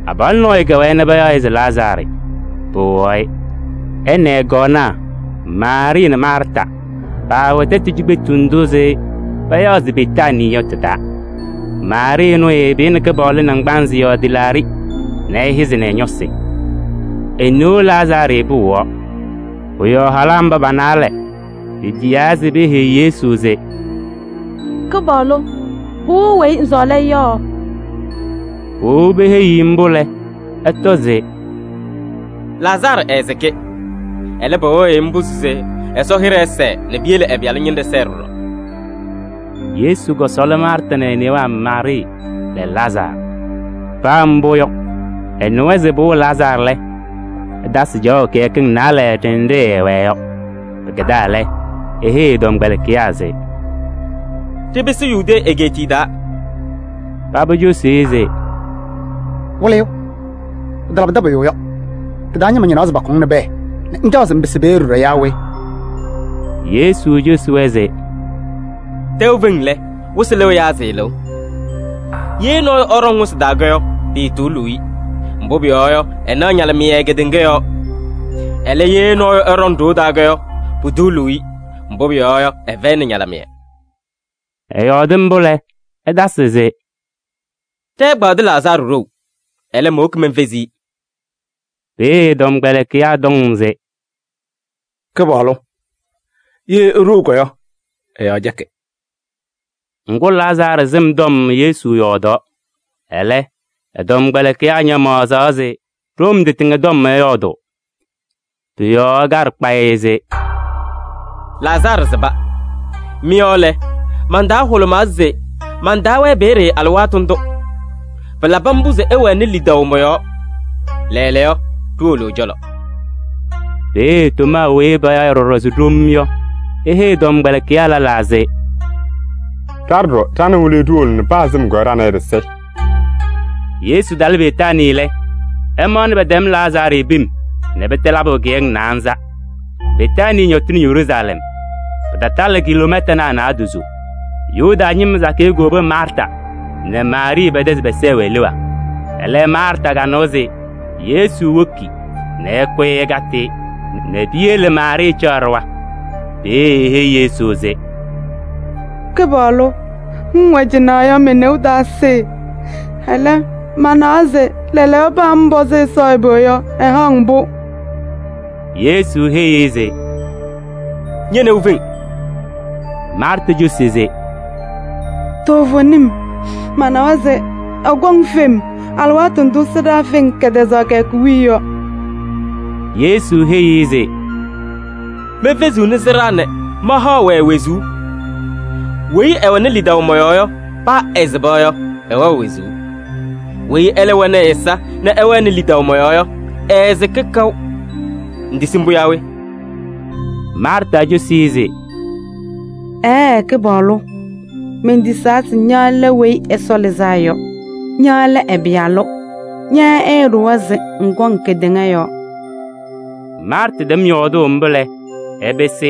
Abalʋ nɔɔyʋ kɛwɛɛ nɛ payaɣ-ɩ se Lazaarɩ, pɩwɩɣaɣ-ɩ. Ɛ nɛ ɛ-kɔɔnaa Maarɩɩ nɛ Maarta paawɛ tɛtʋ cikpetu ndʋ payaɣ se Betaanii yɔ tɩ-taa. Maarɩɩ ɛnʋ ɛɛpɩyɩnɩ Kɩpaɣlʋ naŋgbanzɩ yɔɔ tɩlaaɖɩ nɛ ɛhɛzɩnɩ ɛ-ñɔsɩ. E-neu Lazaarɩ pɩwɩɣaɣ. Pʋ-yɔɔ halaa mba pa-naalɛ petiyaa se peheyi Yesu se: “Kɩpaɣlʋ! Pɩwɩɣ weyi ŋsɔɔlɩ-ɩ yɔ.” Powobi peheyi-i mbʋ lɛ, ɛtɔ se: “Lazaarɩ ɛɛsɩkɩ. Ɛlɛ, pɩwɩɣ-ɩ mbʋ se Ɛsɔ hɩɖɛ ɛsɛɛ nɛ piyele ɛ-Pɩyalʋ ñɩnɖɛ sɛɛ ɖɔɖɔ.” Yesu kɔsɔɔlɩ Maarta nɛ e-newaa Maarɩɩ nɛ Lazaarɩ. Paa mbʋ yɔ, ɛnɩwa se pɩwɩɣ Lazaarɩ lɛ, ɛtasɩ caɣʋ kɩyakɩŋ naalɛ ɖenɖe ɛɛwɛɛ yɔ. Pɩkɛdaa lɛ, eheyi ɛ-tɔmkpɛlɩkɩyaa se: “Ɖɩpɩsɩ Yudee egeetiye taa.” Paba cosi-i se: “Wɩlɩyʋ! Pɩtalabɩdɩ pʋyʋ yɔ, ɖɩ-taa ñɩma ñɩnaɣ se pakʋ-ŋ nɛ pɛɛ nɛ ŋcaɣ se ŋpɩsɩ peeye ɖɔɖɔ yaa we?” Yesu cosi-wɛ se: “Tɛʋ feŋ lɛ, wɩsɩ lɩɣ yaa sɩɩlɩɣ? Ye nɔɔyʋ ɛɖɔŋ wɩsɩ taa yɔ, piituuluu-i, mbʋ pʋyɔɔ yɔ, ɛnaɣ ñalɩmɩyɛ kedeŋa yɔɔ. Ɛlɛ, ye nɔɔyʋ ɛɖɔŋ ɖoo taa yɔ, putuuluu-i, mbʋ pʋyɔɔ yɔ, ɛfɛyɩnɩ ñalɩmɩyɛ.” Ɛyɔɔdɩ mbʋ lɛ, ɛtasɩ se: “Ɖɛ-ɛgbaadʋ Lazaarɩ ɖou, ɛlɛ, mowoki menfezi-i.” Peeye ɛ-tɔmkpɛlɩkɩyaa tɔm se: “Kɩpaɣlʋ! Ye eɖou yɔ, ɛ-yɔɔ cɛkɩ.” Ŋgʋ, Lazaarɩ sɩm tɔm Yesu yɔɔdaɣ, ɛlɛ, ɛ-tɔmkpɛlɩkɩyaa ñamaɣzɩɣ se ɖom tɩtɩŋa tɔm ɛyɔɔdʋʋ. Pʋ-yɔɔ ɛkaɖɩ kpayɩ se: “Lazaarɩ sɩba. Mɩ-yɔɔ lɛ, man-taa hʋlʋmaa se mantaawɛɛ peeye alɩwaatʋ ndʋ. Pɩlabɩ mbʋ se ɩwɛnɩ lidaʋ mɔ-yɔɔ. Lɛɛlɛɛyɔ, ɖiwolo ɛ-cɔlɔ.” Peeye Tomaa weyi payaɣ ɖɔɖɔ se Ɖom yɔ, eheyi tɔmkpɛlɩkɩyaa lɛlaa se: “Ɖa ɖɔɖɔ, ɖa nɛ Wɩlɩyʋ ɖiwolo nɛ paa sɩm yɔ ɖa nɛ ɩ ɖɩsɩ!” Yesu talɩ Betaanii lɛ, ɛmaɣnɩ pɛtɛm Lazaarɩ pim nɛ pɩtɛ labʋ kɩyakɩŋ naanza. Betaanii ñɔtɩnɩ Yeruusalɛm. Pɩtatalɩ kiloomɛtanaa naadozo. Yuda ñɩma sakɩyɛ kowobi Maarta nɛ Maarɩɩ pɛ-tɛ se pɛsɛɛ-wɛ leɣa. Ɛlɛ, Maarta kanɩwa se Yesu woki nɛ ɛkʋyɩ ɛkatɩ-ɩ nɛ piyele Maarɩɩ caɣ ɖɩɣa. Peeye eheyi Yesu se: “Kɩpaɣlʋ! Ŋŋwɛ cɩnɛ yɔ, me-neu taasɩ. Ɛlɛ, manawa se: lɛɛlɛɛyɔ, paa ŋpɔzɩ Ɛsɔ ɛbɛ yɔ, ɛhaɣ-ŋ-pʋ.” Yesu heyi-i se: “Ñe-neu feŋ.” Maarta cosi se: “Toovenim, manawa se ɛkɔŋ fem alɩwaatʋ ndʋ sɩɖaa feŋ kɛtɛzaɣ kɩyakʋ wiye yɔ.” Yesu heyi-i se: “Mefeziɣni sɩɖaa nɛ mahaɣ-wɛ wezuu. Weyi ɛwɛnɩ lidaʋ mɔ-yɔɔ yɔ, paa ɛsɩba yɔ, ɛwɛɣ wezuu. Weyi ɛlɛ wɛnɩ ɛ-ɛza nɛ ɛwɛnɩ lidaʋ mɔ-yɔɔ yɔ, ɛɛsɩkɩ kaʋ. Ŋtisi mbʋ yaa we?” Maarta cosi-i se: “Ɛɛɛ, Kɩpaɣlʋ! Mentisaa se ña lɛ Weyi Ɛsɔ Lɩzaa Yɔ. Ña lɛ ɛ-Pɩyalʋ, ña ɛɛɖʋwa se ŋkɔŋ kedeŋa yɔɔ.” Maarta tɛm yɔɔdʋʋ mbʋ lɛ, ɛpɩsɩ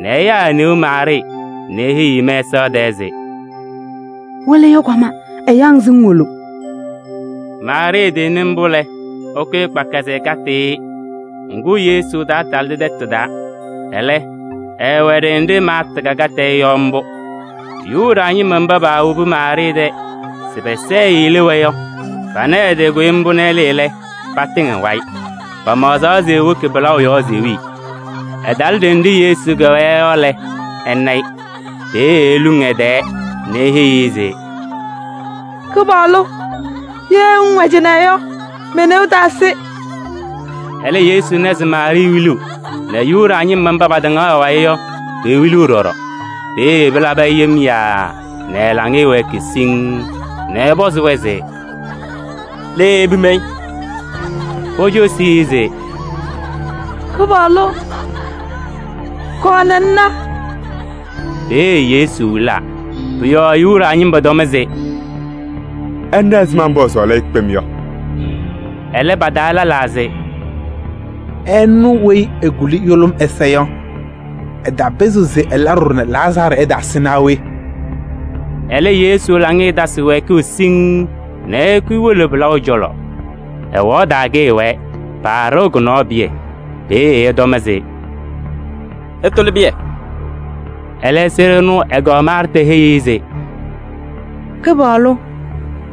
nɛ ɛyaa e-neu Maarɩɩ nɛ eheyiɣ-i mɛsaɣ tɛɛ se: “Wɩlɩyʋ kɔma, ɛyaɣ-ŋ se ŋwolo.” Maarɩɩ tɩnɩ mbʋ lɛ, ɛkʋyɩ kpaka se ɛkatɩ-ɩ. Ŋgʋ, Yesu taatalɩdɩ tɛtʋ taa, ɛlɛ, ɛɛwɛ ɖenɖe Maarta kakatɩ-ɩ yɔ mbʋ. Yuda ñɩma mba paawobi Maarɩɩ tɛ se pɛsɛɛ-ɩ leɣa yɔ, pana ɛtɩkʋyɩ mbʋ nɛ ɛlɩɩ lɛ, patɩŋ ɛ-wayɩ. Pamaɣzaɣ se ewoki pɩlaʋ yɔɔ se ewili. Ɛtalɩ ɖenɖe Yesu kɛwɛɛ yɔ lɛ, ɛna-ɩ. Peeye eluŋ ɛ-tɛɛ nɛ eheyi-i se: “Kɩpaɣlʋ! Ye ŋŋwɛ cɩnɛ yɔ, me-neu taasɩ.” Ɛlɛ Yesu na se Maarɩɩ wiliɣ nɛ Yuda ñɩma mba patɩŋaɣ ɛ-wayɩ yɔ, pewiliɣ ɖɔɖɔ. Peeye pɩlabɩ-ɩ yem yaaa nɛ ɛ-laŋɩyɛ wɛɛkɩ siŋŋ nɛ ɛpɔzɩ-wɛ se: “Le ipim-i?” Pocosi-i se: “Kɩpaɣlʋ! Kɔɔ nɛ ŋna.” Peeye Yesu wilaa. Pʋ-yɔɔ Yuda ñɩma tɔm se: “Ɩna ɛzɩma mbʋ ɛɛsɔɔlɩ-ɩ kpem yɔ!” Ɛlɛ, pa-taa lɛlaa se: “Ɛnʋ weyi ekuli yʋlʋm ɛza yɔ, ɛtaapɩzɩɣ se ɛla ɖɔɖɔ nɛ Lazaarɩ ɛtaasɩ naa we?” Ɛlɛ, Yesu laŋɩyɛ tasɩ wɛɛkʋʋ siŋŋ nɛ ɛkʋyɩ ewolo pɩlaʋ cɔlɔ. Ɛwaɣ taa kɩɩwɛɛ, paɖɩɣ kʋ-nɔɔ pɩyɛ. Peeye ɛtɔm se: “Ɩtʋlɩ pɩyɛ.” Ɛlɛ, sɩɖʋ ɛnʋ ɛ-kɔɔ Maarta heyi-i se: “Kɩpaɣlʋ!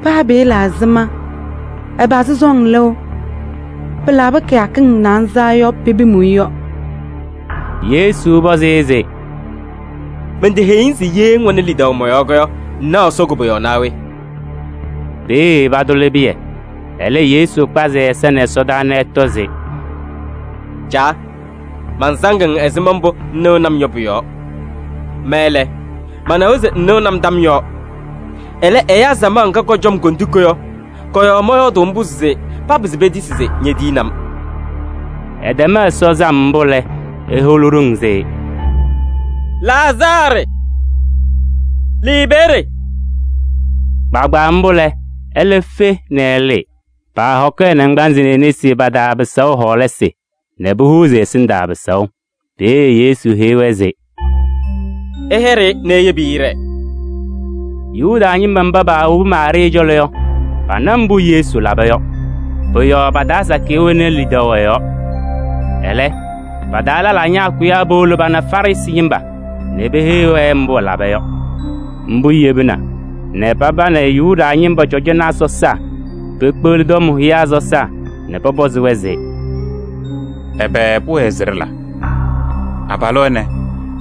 Paa pɩɩla ɛzɩma ɛpazɩ sɔŋ lɩʋ: pɩlabɩ kɩyakɩŋ naanza yɔ pepim-i yɔ.” Yesu pɔzɩ-ɩ se: “Menteheyi-ŋ se ye ŋwɛnɩ lidaʋ mɔ-yɔɔ yɔ ŋnaɣ Ɛsɔ koboyaɣ naa we?” Peeye patʋlɩ pɩyɛ. Ɛlɛ Yesu kpazɩ ɛ-ɛza ɛsɔdaa nɛ ɛtɔ se: “Caa! Mansaŋ-ŋ ɛzɩma mbʋ ŋnɩnɩ-m yɔ pʋ-yɔɔ. Ma lɛ, manawa se ŋnɩɣnɩ-m tam yɔɔ. Ɛlɛ, ɛyaa samaɣ ŋga kɔcɔ-m kondiko yɔ, kɔ-yɔɔ mɔyɔɔdʋʋ mbʋ se papɩzɩ petisi se ñetiyini-m.” Ɛtɛm Ɛsɔ sam mbʋ lɛ, eholi ɖoŋ se: “Lazaarɩ! Lɩɩ peeye!” Kpaagbaa mbʋ lɛ, ɛlɛ fe nɛ ɛlɩɩ. Paahɔkɩ ɛ-naŋgbanzɩ nɛ e-nesi pa-taa pɩsaʋ hɔɔlasɩ nɛ pohuuzi ɛ-ɛsɩndaa pɩsaʋ. Peeye Yesu heyi-wɛ se: “Ɩyɛɖɩ-ɩ nɛ iyebi-i ɛɖɛɛ.” Yuda ñɩma mba paawobi Maarɩɩ cɔlɔ yɔ, pana mbʋ Yesu laba yɔ. Pʋ-yɔɔ pa-taa sakɩyɛ wɛnɩ lidaʋ ɛ-yɔɔ. Ɛlɛ, pa-taa lɛlaa ñaakʋyaa powolo pana Farɩsɩ ñɩma nɛ peheyi-wɛ mbʋ ɛlaba yɔ. Mbʋ yebina nɛ paba nɛ Yuda ñɩma cɔjɔnaa sɔsaa pekpeɣli tɔm hʋyaa sɔsaa nɛ pɔpɔzɩ-wɛ se: “Ɛbɛ pʋwɛɛ se ɖɩla? Abalʋ ɛnɛ,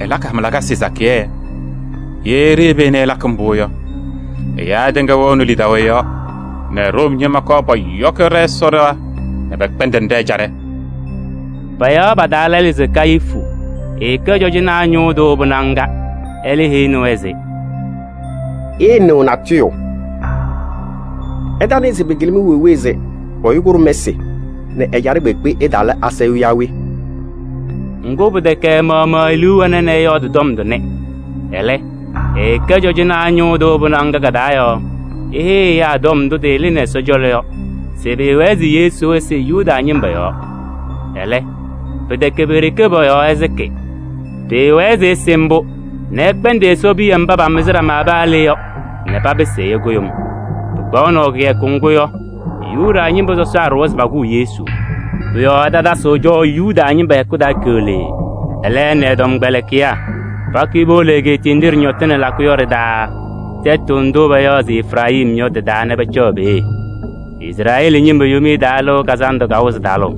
ɛlakɩ hama lakasɩ sakɩyɛ! Ye ɖiyebi-i nɛ ɛlakɩ mbʋ yɔ, ɛyaa tɩŋa wɛɣnɩ lidaʋ ɛ-yɔɔ nɛ Room ñɩma kɔɔ pɔyɔkɩ ɖɛ-Ɛsɔ ɖɩɣa nɛ pɛkpɛndɩnɩ ɖɛ-ɛjaɖɛ!” Payaɣ pa-taa lɛlʋ se Kayifu, ɛkɛ cɔjɔnaa ñʋʋ tʋ pɩnaɣ ŋga, ɛlɛ heyini-wɛ se: “Ɩɩnɩɣ natʋyʋ! Ɩtanɩɩ se pɩkɩlɩ-mɩ wee wee se ɛyʋ kʋɖʋm ɛsɩ nɛ ɛjaɖɛ kpeekpe ɛtaala asayʋʋ yaa we?” Ŋgʋ, pɩtɛkɛ ɛ-maɣmaɣ e-liu wɛna nɛ ɛyɔɔdɩ tɔm tʋnɛ. Ɛlɛ, ɛɛkɛ cɔjɔnaa ñʋʋ tʋ pɩnaɣ ŋga ka-taa yɔɔ eheyi ɛyaa tɔm ndʋ tɩlɩnɩ Ɛsɔ cɔlɔ yɔ se pʋwɛɛ se Yesu ɛsɩ Yuda ñɩma yɔɔ. Ɛlɛ, pɩtɛkɛ pe-ɖeke pɔ-yɔɔ ɛsɩkɩ. Pɩɩwɛɛ se ɛsɩ mbʋ nɛ ɛkpɛndɩ Ɛsɔ piya mba pamɩzɩ ɖama paa le yɔ nɛ papɩsɩ ɛyʋ kʋɖʋm. Pɩkpaɣʋnɩ kɩyakʋ ŋgʋ yɔ Yuda ñɩma sɔsaa ɖʋwa se pakʋʋ Yesu. Pʋ-yɔɔ ɛtatasɩɣ cɔʋ Yuda ñɩma hɛkʋ taa keɣlee. Ɛlɛ, ɛ nɛ ɛ-tɔmkpɛlɩkɩyaa pakʋyɩ powolo egeetiye nɖɩ ɖɩñɔtɩnɩ lakʋ yɔ ɖɩ-taa, tɛtʋ ndʋ payaɣ se Efirayim yɔ, tɩ-taa nɛ pacaɣ peeye. Izrɛɛlɩ ñɩma Yomiye Taa Lɩʋ Kazandʋ kawɩzɩ talʋʋ.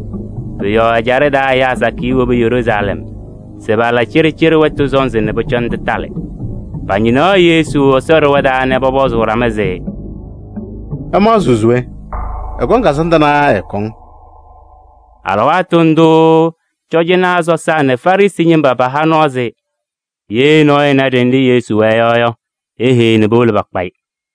Pʋ-yɔɔ ɛjaɖɛ taa ɛyaa sakɩyɛ wobi Yeruusalɛm se pala cɩɖɩcɩɖɩ wɛtʋ sɔnzɩ nɛ pʋcɔ tɩtalɩ. Pañɩnaɣ Yesu Ɛsɔ ɖɩɣa taa nɛ pɔpɔzʋʋ ɖama se: “Ɩmaɣzɩɣ se we? Ɛkɔŋ kazandʋ naa ɛɛkɔŋ?” Alɩwaatʋ ndʋʋ cɔjɔnaa sɔsaa nɛ Farɩsɩ ñɩma paha nɔɔ se: ye nɔɔyʋ ɛna ɖenɖe Yesu wɛɛ yɔ yɔ, eheyi nɛ powolo pakpa-ɩ.